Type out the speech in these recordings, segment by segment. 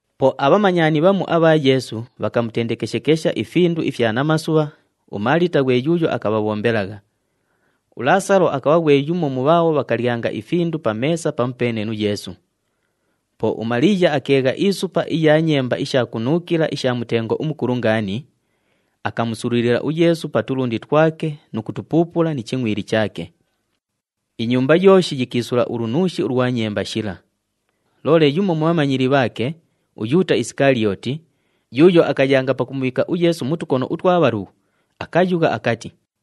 Po abhamanyani bhamu abha Yeesu bhakamutendekeshekesha ifindu ifya namasubha, uMaalita ghwe yuuyo akabhabhombelagha. ULaasalo akabha ghwe yumo mu bhaabho bhakalyanga ifindu pa meesa pamupeene nu Yeesu. Po uMaliiya akeegha isupa iya nyemba isha kunuukila isha mutengo umukulu ngaani, akamusululila uYeesu pa tulundi twake nu kutupuupula ni chingʼwili chaake. Inyumba yooshi yikiisula ulunuushi ulwa nyemba shila. Loole yumo mu bhamanyili bhaake, uYuuta Isikaliyooti, yuuyo akayanga pakumubhiika uYeesu mu tukono utwa bhalughu, akayugha akati,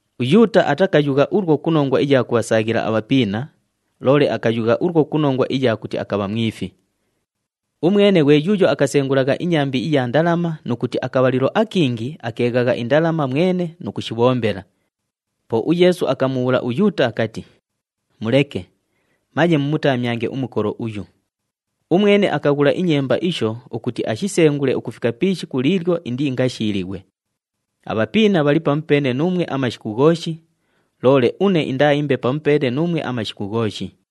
UYuuta atakayugha ulwo ku nongwa iya kubhasaaghila abhapiina, loole akayugha ulwo ku nongwa iya kuti akabha mwifi. Umwene ghwe yuuyo akasengulagha inyambi iya ndalama nu kuti akabhalilo akingi akeeghagha indalama mwene nu kushibhombela. Po uYeesu akamwamula uYuuta akati, “Muleke! Manye mumutamyange umukolo uyu. Umwene akaghula inyemba isho ukuti ashisengule ukufika pi ishiku liilyo indiingashiilighwe. Abhapiina bhali pamupeene nuumwe amashiku ghooshi, loole une indaaimbe pamupeene nuumwe amashiku ghooshi.”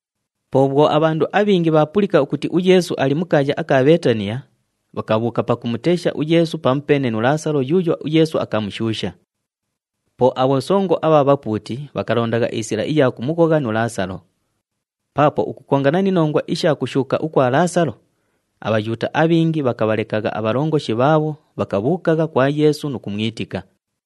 Po bhwo abhandu abhingi bhaapulika ukuti uYeesu ali mu kaaya aka Bheetaniya, bhakabhuuka pakumutesha uYeesu pamupeene nu Laasalo yuuyo uYeesu akamushuusha. Po abhosongo abha bhapuuti bhakalonda isila iya kumughogha nu Laasalo. Paapo ukukongana ni nongwa isha kushuuka ukwa Laasalo, aBhayuuta abhingi bhakabhalekagha abhalongoshi bhaabho, bhakabhuukagha kwa Yeesu nu kumwitika.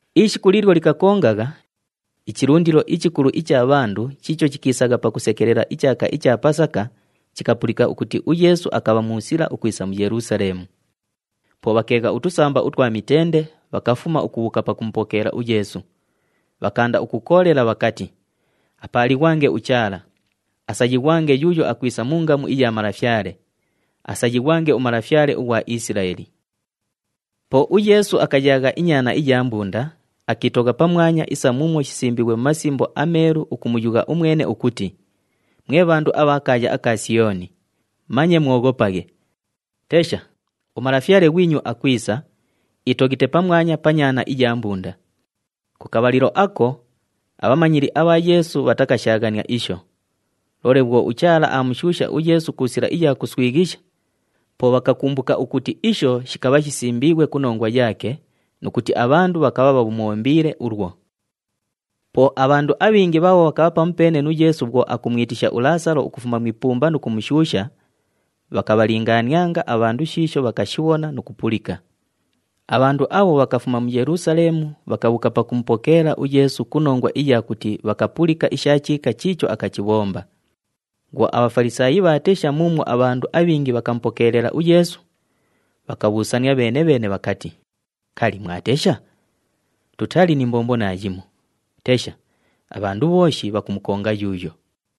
Ishiku liilyo likakongagha, ichilundilo ichikulu icha bhandu chiicho chikiisagha pakusekelela ichaaka icha Pasaka chikapulika ukuti uYeesu akabha mu sila ukwisa mu Yelusaleemu. Po bhakeegha utusamba utwa mitende, bhakafuma ukubhuuka pakumupokeela uYeesu. Bhakaanda ukukoolela bhakati, “Apaalighwange uChaala! Asayighwange yuuyo akwisa mu ngamu iya Malafyale! Asayighwange uMalafyale ughwa Isilaeli!” Po uYeesu akayaagha inyaana iya mbunda, akiitogha pamwanya isa muumwo shisimbiighwe mu Masimbo aMeelu ukumuyugha umwene ukuti, “Mwe bhandu abha kaaya aka Siyooni, manye mwoghopaghe! Tesha, uMalafyale ghwinyu akwisa, iitoghite pamwanya pa nyaana iya mbunda!” Ku kabhalilo ako, abhamanyili abha Yeesu bhatakashaaghania isho. Loole bhwo uChaala aamushuusha uYeesu ku sila iya kuswighisha, po bhakakumbuka ukuti isho shikabha shisimbiighwe ku nongwa yaake nu kuti abhandu bhakabha bhamubhombiile ulwo. Po abhandu abhingi bhaabho bhakabha pamupeene nu Yeesu bhwo akumwitisha uLaasalo ukufuma mu ipumba nu kumushuusha, bhakabhalingaanianga abhandu shiisho bhakashibhona nu kupulika. Abhandu abho ukufuma mu Yelusaleemu bhakabhuuka pakumupokeela uYeesu ku nongwa iya kuti bhakapulika isha chiika chiicho akachibhomba. Bhwo aBhafalisaayi bhaatesha muumwo abhandu abhingi bhakamupokeelela uYeesu, bhakabhuusania bheene-bheene bhakati, “Kali, mwatesha? Tutali ni mbombo naayimo! Tesha! Abhandu bhooshi bhakumukonga yuuyo.”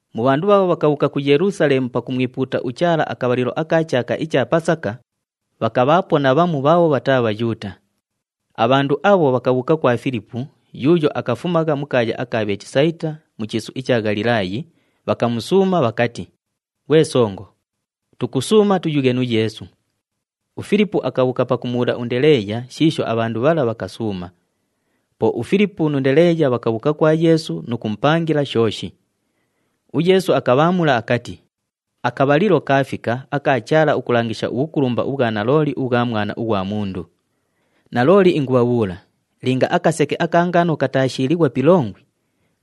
Mu bhandu bhaabho bhakabhuuka ku Yelusaleemu pakumwipuuta uChaala akabhalilo aka chaaka icha Pasaka, bhakabhaapo na bhamu bhaabho bhataa Bhayuuta. Abhandu abho bhakabhuuka kwa Filipu yuuyo akafumagha mu kaaya aka Bheetisayita mu chiisu icha Ghalilaayi, bhakamusuuma bhakati, “Ghwe songo, tukusuuma tuyughe nu Yeesu.” UFilipu akabhuuka pakumubhuula uNdeleeya shiisho abhandu bhala bhakasuuma. Po uFilipu nu Ndeleeya bhakabhuuka kwa Yeesu nu kumupangila shooshi. UYeesu akabhaamula akati, “Akabhalilo kaafika aka Chaala ukulangisha ubhukulumba ubhwa nalooli ubhwa Mwana ughwa Mundu. Nalooli ingubhabhuula, linga akaseke aka ngano kataashiilighwa pi ilongwi,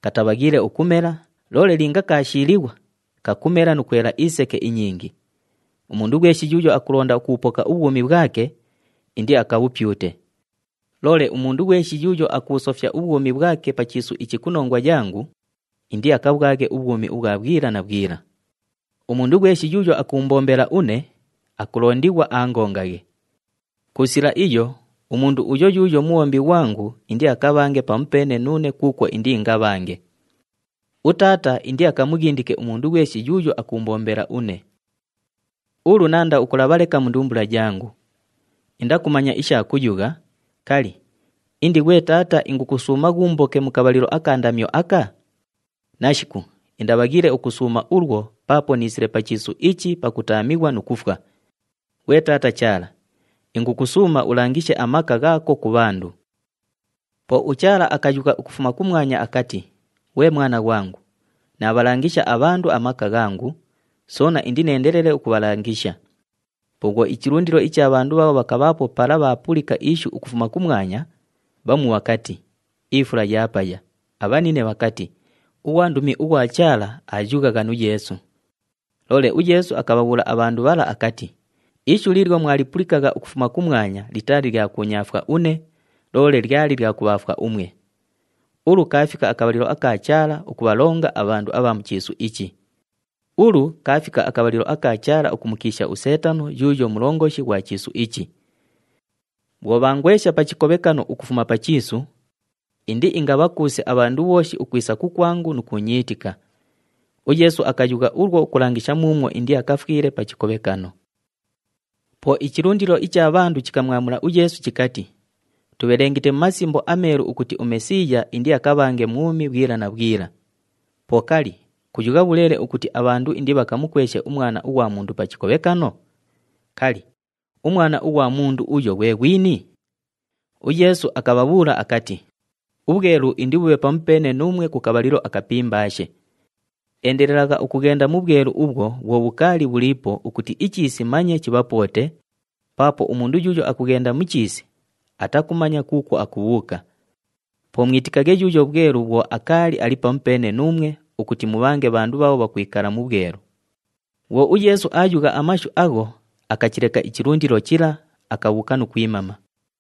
katabhaghiile ukumela, loole linga kaashiilighwa, kakumela nu kwela iseke inyingi. Umundu ghweshi yuuyo akulonda ukubhupoka ubhwumi bhwake, indiakabhupyute. Loole umundu ghweshi yuuyo akubhusofya ubhwumi bhwake pa chiisu ichi ku nongwa yangu, indiakabhwaghe ubhwumi ubhwa bhwila na bhwila. Umundu ghweshi yuuyo akuumbombela une, akulondighwa aangongaghe. Ku sila iyo umundu uyo yuuyo mubhombi ghwangu indiakabhange pamupeene nuune kuukwo indiingabhange. UTaata indiakamughindike umundu ghweshi yuuyo akuumbombela une. “Ulu naanda ukulabha leka mu ndumbula yangu. Indakumanya isha kuyugha, ‘Kali, indi ghwe Taata, ingukusuuma ghuumboke mu kabhalilo aka ndamyo aka?’ Nashiku, indabhaghiile ukusuuma ulwo paapo niisile pa chiisu ichi pakutaamighwa nu kufwa. Ghwe Taata Chaala, ingukusuuma ulangishe amaka ghaako ku bhandu.” Po uChaala akayugha ukufuma kumwanya akati, “Ghwe Mwana ghwangu, naabhalangisha abhandu amaka ghangu, soona indineendelele ukubhalangisha.” Po bhwo ichilundilo icha bhandu bhaabho bhakabhaapo pala bhaapulika ishu ukufuma kumwanya, bhamu bhakati, “Ifula yaapaya,” abhanine bhakati, “Ughwandumi ughwa Chaala aayughagha nu Yeesu.” Loole uYeesu akabhabhuula abhandu bhala akati, “Ishu liilyo mwalipulikagha ukufuma kumwanya litaali lya kuunyaafwa une, loole lyali lya kubhaafwa umwe. Ulu kaafika akabhalilo aka Chaala ukubhalonga abhandu abha mu chiisu ichi. Ulu kaafika akabhalilo aka Chaala ukumukiisha uSeetano yuuyo mulongoshi ghwa chiisu ichi. Bhwo bhaangwesha pa chikobhekano ukufuma pa chiisu, indiingabhakuuse abhandu bhooshi ukwisa kukwangu nu kuunyiitika.” UYeesu akayugha ulwo ukulangisha muumwo indiakafwile pa chikobhekano. Po ichilundilo icha bhandu chikamwamula uYeesu chikati, “Tubhelengite mu Masimbo aMeelu ukuti uMesiiya indiakabhange mwumi bhwila na bhwila. Po kali, kuyugha bhuleele ukuti abhandu indibhakamukweshe uMwana ughwa Mundu pa chikobhekano? Kali, uMwana ughwa Mundu uyo ghwe ghwini?” UYeesu akabhabhuula akati, “Ubhwelu indibhubhe pamupeene nuumwe ku kabhalilo akapimbaashe. Endelelagha ukughenda mu bhwelu ubhwo bhwo bhukaali bhuliipo ukuti ichiisi manye chibhapoote, paapo umundu yuuyo akughenda mu chiisi, atakumanya kuukwo akubhuuka. Po mwitikaghe yuuyo bhwelu bhwo akaali ali pamupeene nuumwe ukuti mubhange bhandu bhaabho bhakwikala mu bhwelu.” Bhwo uYeesu aayugha amashu agho, akachileka ichilundilo chila, akabhuuka nu kwimama.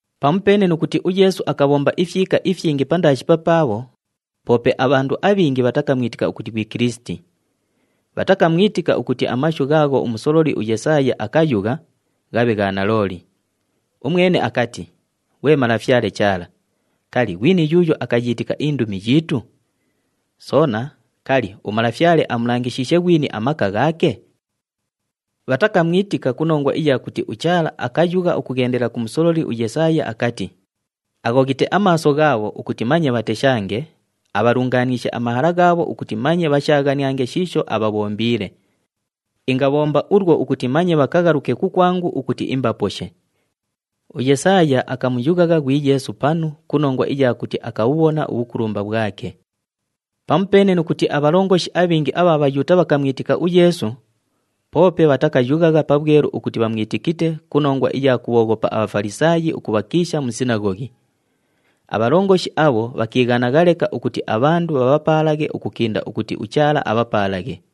Pamupeene nu kuti uYeesu akabhomba ifyika ifyingi pandaashi papaabho, poope abhandu abhingi bhatakamwitika ukuti ghwi Kilisiti. Bhatakamwitika ukuti amashu ghaagho umusololi uYesaaya akayugha, ghabhe gha nalooli. Umwene akati, “Ghwe Malafyale Chaala, kali, ghwini yuuyo akayiitika indumi yiitu? Soona, kali, uMalafyale amulangishiishe ghwini amaka ghaake?” Bhatakamwitika ku nongwa iya kuti uChaala akayugha ukughendela ku musololi uYesaaya akati, “Aghoghite amaaso ghaabho ukuti manye bhateshange, abhalungaaniishe amahala ghaabho ukuti manye bhashaaghaniange shiisho abhabhombiile. Ingabhomba ulwo ukuti manye bhakaghaluke kukwangu ukuti imbaposhe.” UYesaaya akamuyughagha ghwi Yeesu panu ku nongwa iya kuti akabhubhona ubhukulumba bhwake. Pamupeene nu kuti abhalongoshi abhingi abha Bhayuuta bhakamwitika uYeesu, poope bhatakayughagha pabhwelu ukuti bhamwitikite ku nongwa iya kubhooghopa aBhafalisaayi ukubhakiisha mu sinaghoghi. Abhalongoshi abho bhakiighanagha leka ukuti abhandu bhabhapaalaghe ukukinda ukuti uChaala abhapaalaghe.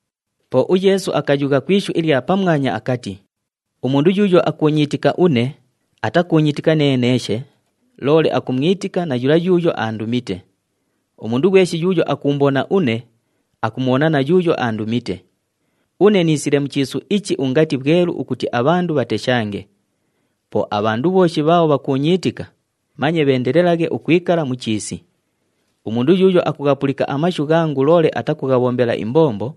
Po uYeesu akayugha ku ishu ilya pamwanya akati, “Umundu yuuyo akuunyiitika une, atakuunyiitika neneeshe, loole akumwitika na yula yuuyo aandumite. Umundu ghweshi yuuyo akuumbona une, akumubhona na yuuyo aandumite. Une niisile mu chiisu ichi ungati bhwelu ukuti abhandu bhateshange. Po abhandu bhooshi bhaabho bhakuunyiitika, manye bheendelelaghe ukwikala mu chiisi. Umundu yuuyo akughapulika amashu ghangu loole atakughabhombela imbombo,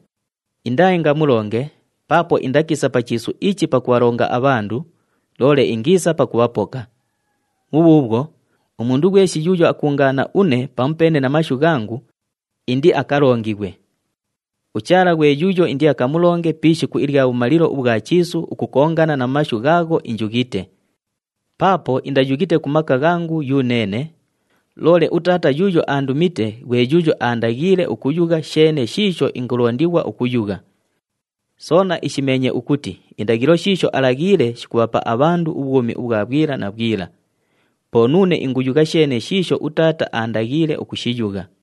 indaaingamulonge paapo indakiisa pa chiisu ichi pakubhalonga abhandu, loole ingiisa pakubhapoka. Bhubhuubhwo, umundu ghweshi yuuyo akuungaana une pamupeene na mashu ghangu indiakalongighwe. UChaala ghwe yuuyo indiakamulonge pi ishiku ilya bhumalilo ubhwa chiisu ukukongana na mashu ghaagho injughite. Paapo indayughite ku maka ghangu yuneene, loole uTaata yuuyo aandumite ghwe yuuyo aandaghiile ukuyugha sheene shiisho ingulondighwa ukuyugha. Soona ishimeenye ukuti indaghilo shiisho alaghiile shikubhapa abhandu ubhwumi ubhwa bhwila na bhwila. Po nuune inguyugha sheene shiisho uTaata aandaghiile ukushiyugha.”